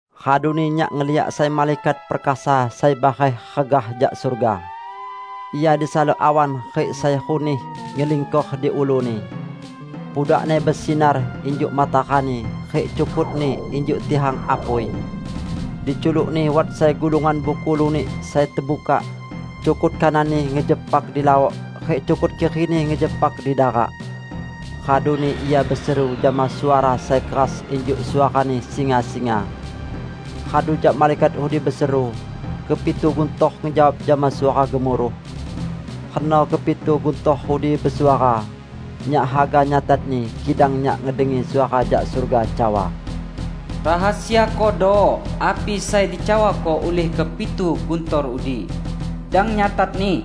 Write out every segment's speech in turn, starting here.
Raduni nyak ngeliak sai malaikat perkasa sai bareh regah jak surga. Ia disalok awan, rik sai runih ngelingkor di uluni. Pudakni besinar injuk matarani, rik cukutni injuk tihang apui. Di culukni wat sai gulungan buku lunik sai tebukak. Cukut kananni ngejepak di laok, rik cukut kirini ngejepak di darak. Raduni ia beseru jama suara sai keras injuk suarani singa-singa. Radu jak malaikat udi beseru, kepitu guntor ngejawab jama suara gemuruh. Reno kepitu guntor udi besuara, nyak haga nyatatni, kidang nyak ngedengi suara jak surga cawa, "Rahasiakodo api sai dicawako ulih kepitu guntor udi; dang nyatatni!"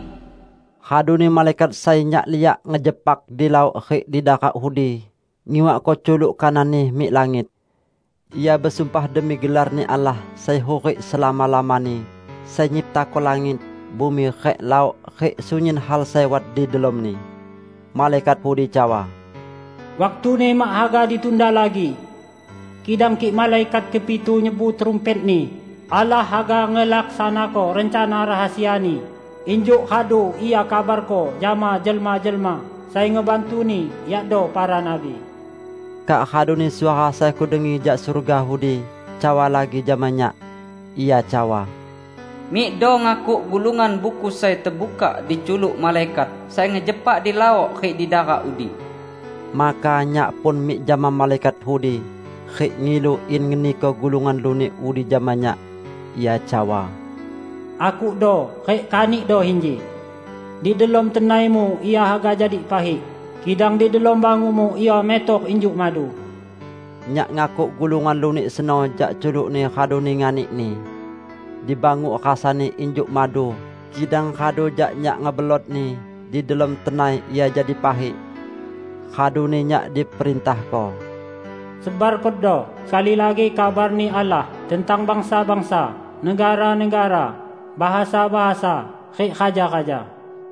Raduni malaikat sai nyak liak ngejepak di laok rik di darak udi ngiwakko culuk kananni mik langit. Ia besumpah demi gelar-Ni Allah sai hurik selama-lamani, sai nyiptako langit, bumi rik laok rik sunyin hal sai wat di delomni. Malaikat udi cawa, "Waktuni mak haga ditunda lagi! Kidang kik malaikat kepitu nyebu trumpetni, Allah haga ngelaksanako rencana rahasia-Ni, injuk radu Ia kabarko jama jelma-jelma sai ngebantu-Ni yakdo para nabi." Kak raduni suara sai kudengi jak surga udi, cawa lagi jama nyak. Ia cawa, "Mikdo ngakuk gulungan buku sai tebukak di culuk malaikat sai ngejepak di laok rik di darak udi." Maka nyak pun mik jama malaikat udi rik ngilu in ngeniko gulungan lunik udi jama nyak. Ia cawa, "Akukdo rik kanikdo inji. Di delom tenaimu ia haga jadi pahik, kidang di delom bangukmu ia metor injuk madu." Nyak ngakuk gulungan lunik seno jak culukni raduni nganikni. Di banguk rasani injuk madu, kidang radu jak nyak ngebelotni, di delom tenai ia jadi pahik. Raduni nyak diperintahko, "Sebarkodo sekali lagi kabar-Ni Allah tentang bangsa-bangsa, negara-negara, bahasa-bahasa, rik raja-raja."